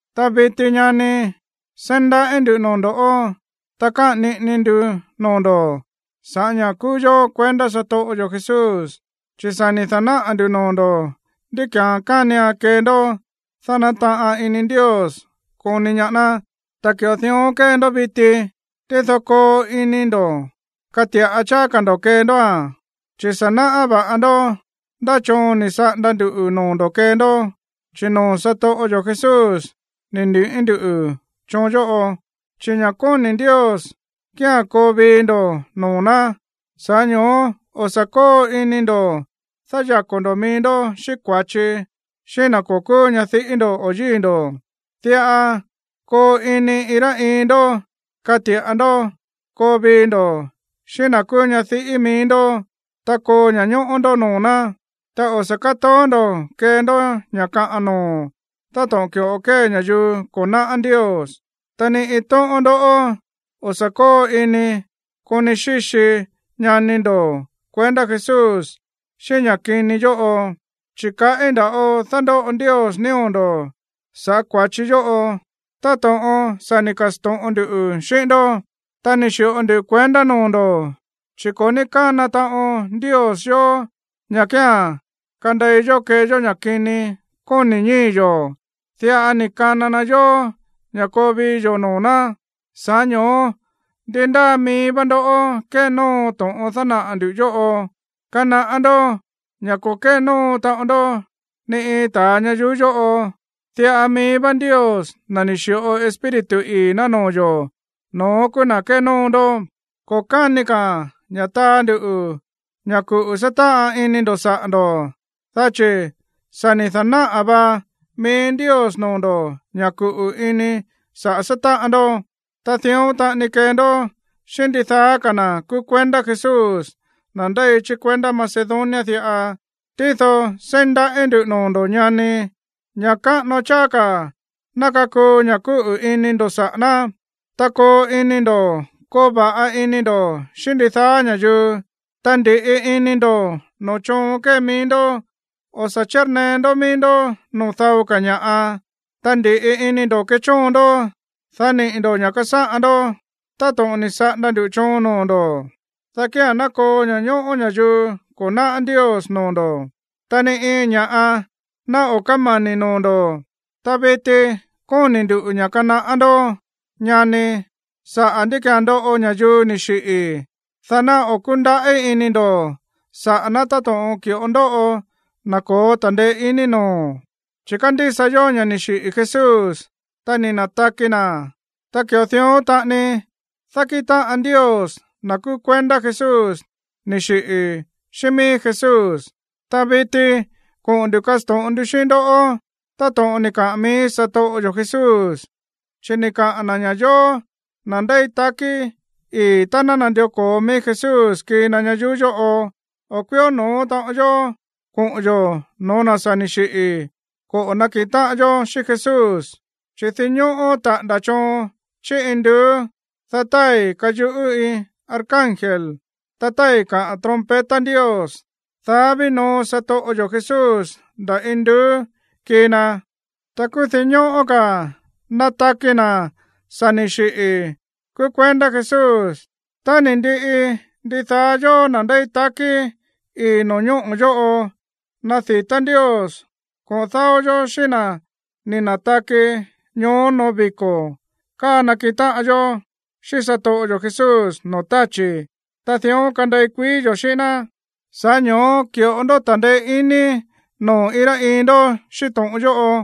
Ta viti, ñani, seí ndaꞌí ndu̱ noo̱ ndo̱, ta káꞌa̱n niꞌini ndu noo̱ ndo̱ sa̱ꞌá ña̱ kúú yó kuendá satoꞌo yo̱ Jesús. Chi̱ sa̱ ni̱ da̱náꞌa̱ ndu̱ noo̱ ndo̱ ndí ki̱án kánian kee ndó, dá nataꞌan ini Ndios koni ñaá ná. Ta ki̱ꞌo dión kée ndó viti, tído koo ini ndo̱ kati̱ꞌa cháá ka̱ ndo̱ kee ndóa̱n. Chi̱ sa̱ náꞌá vá ndó ndá choon ni̱ saꞌanda ndu̱ noo̱ ndo̱ kee ndó, chi̱ noo̱ satoꞌo yo̱ Jesús ni̱ ni̱ꞌí nduꞌu̱ choon yóꞌo. Chi̱ ña̱ kóni̱ Ndios kía̱n koo vii ndo̱ noo̱ ná. Sa̱ꞌá ño̱ó o̱ sa̱ kóo ini ndo̱ dáyako̱ ndo̱ mií ndó xíꞌín kua̱chi xíꞌín na̱ ko̱ kúú ñadiꞌí ndo̱ o yíi̱ ndo̱. Diꞌa koo ini iin rá iin ndó kati̱ꞌa ndó koo vii ndo̱ xíꞌín na̱ kúú ñadiꞌí mií ndó, ta koo ña̱ñóꞌó ndó noo̱ ná. Ta o̱ sa̱ kátoó ndo̱ kee ndó ña̱ kaꞌan noo̱ táto̱ꞌon ki̱ꞌo kée ña̱yuu ko̱ náꞌá Ndios. Ta ni iin tóꞌón ndó o̱ sa̱ kóo ini koni xíxi ñani ndo̱ kuendá Jesús xíꞌín ña̱ kini yóꞌo, chi̱ kaꞌí nda̱ꞌo dándóꞌo Ndios nío̱ ndo̱ sa̱ꞌá kua̱chi yóꞌo táto̱ꞌon sa̱ ni̱ ka̱sto̱ꞌon ndu xíꞌín ndó, ta ni̱ xi̱ꞌo ndu kuendá noo̱ ndo̱. Chi̱ ko̱ ní kána taꞌon Ndios yó ña̱ kía̱n kandei yó kee yó ña̱ kini kóni̱ ñíi̱ yo̱. Diꞌa ni̱ kana na yó ña̱ koo vii yo̱ noo̱ ná. Sa̱ꞌá ño̱ó ndi ndáa mií vá ndó kénóo to̱ꞌon dánaꞌa̱ ndu̱ yóꞌo, kanaꞌá ndó ña̱ ko̱ kénóo taꞌon ndó ni iin ta̱a ñayuú yóꞌo. Diꞌa mií vá Ndios, na̱ ni̱ xi̱ꞌo Espíritu ii̱ ná noo̱ yo̱, no̱ón kúú na̱ kénóo ndó. Ko̱ káni ka̱a̱n ña̱ taa nduꞌu̱ ña̱ kuꞌu̱ sátáꞌan ini ndo̱ saꞌa̱ ndo̱, dá chi̱ sa̱ ni̱ da̱náꞌa̱ va mií Ndios noo̱ ndo̱ ña̱ kuꞌu̱ ini saꞌa̱ sátáꞌan ndó. Ta dión taꞌani kée ndó xíꞌín ndidaá ka̱ na̱ kúú kuendá Jesús, na̱ ndéi chí kuendá Macedonia diꞌa. Tído seí ndaꞌí ndu̱ noo̱ ndo̱, ñani, ña̱ káꞌano cháá ka̱ ná kakuu ña̱ kúꞌu̱ ini ndo̱ saꞌa̱ ná. Ta koo ini ndo̱ koo va̱ꞌa ini ndo̱ xíꞌín ndidaá ña̱yuu. Ta ndi̱ꞌi ini ndo̱ noo̱ choon kée mií ndó, o̱ sa̱ chírnee ndó mií ndó noo̱ dao ka̱ ña̱ꞌa. Ta ndi̱ꞌi ini ndo̱ kechóon ndó, dá niꞌi̱ ndo̱ ña̱ꞌa kasáꞌan ndó, táto̱ꞌon ni̱ saꞌanda ndu̱ choon noo̱ ndo̱. Dá kía̱n ná koo ña̱ñóꞌó ña̱yuu ko̱ náꞌá Ndios noo̱ ndo̱, ta ni iin ña̱ꞌa ná o̱ kámani̱ noo̱ ndo̱. Ta viti kóni̱ nduꞌu̱ ña̱ kanaꞌá ndó, ñani, saꞌa̱ ndí ki̱án ndoꞌo ña̱yuu ni̱ xiꞌi̱, dá ná o̱ kúndaꞌí ini ndo̱ saꞌa̱ ná táto̱ꞌon ki̱ꞌo ndóꞌo na̱ ko̱ó ta̱ndeé iní noo̱. Chi̱ kándísa yó ña̱ ni̱ xiꞌi̱ Jesús, ta ni̱ na̱taki na̱. Ta ki̱ꞌo dión taꞌani dákíꞌin táꞌan Ndios na̱ kúú kuendá Jesús ni̱ xiꞌi̱ xíꞌín mií Jesús. Ta viti koꞌo̱n ndu̱ kasto̱ꞌon ndu xíꞌín ndó to̱ꞌon ni̱ kaꞌa̱n mií satoꞌo yo̱ Jesús, chi̱ ni̱ kaa na̱ ña̱ yóó, na̱ ndéi takí ii̱ tá ná nandió ko̱o mií Jesús kii na ñayuú yóꞌo, o̱ kuió no̱ó taꞌon yó koꞌo̱n yo̱ no̱ó na̱ sa̱ ni̱ xiꞌi̱ koꞌo̱ nakiꞌin táꞌan yó xíꞌín Jesús. Chi̱ dinñóꞌó taꞌa̱nda̱ choon chí induú, dá tái̱ kayuꞌú iin arcángel, ta tái̱ kaꞌa̱n trompeta Ndios, dá ví noo satoꞌo yo̱ Jesús nda̱ induú kii na. Ta kúú dinñóꞌó ka̱ nataki na̱ sa̱ ni̱ xiꞌi̱ kúú kuendá Jesús. Tá ni̱ ndiꞌi, ndidaá yóó, na̱ ndéi takí ii̱ no̱ñóꞌo̱ yóꞌo, nadi̱tá Ndios koꞌo̱n dáó yó xíꞌín na̱ ni̱ na̱taki ñoó noo̱ viko̱ káa nakiꞌin táꞌan yó xíꞌín satoꞌo yo̱ Jesús no̱ó tachi̱. Ta dión kandei kuií yo̱ xíꞌín ná. Sa̱ꞌá ño̱ó ki̱ꞌo ndó ta̱ndeé iní noo̱ iin rá iin ndó xíꞌín to̱ꞌon yóꞌo.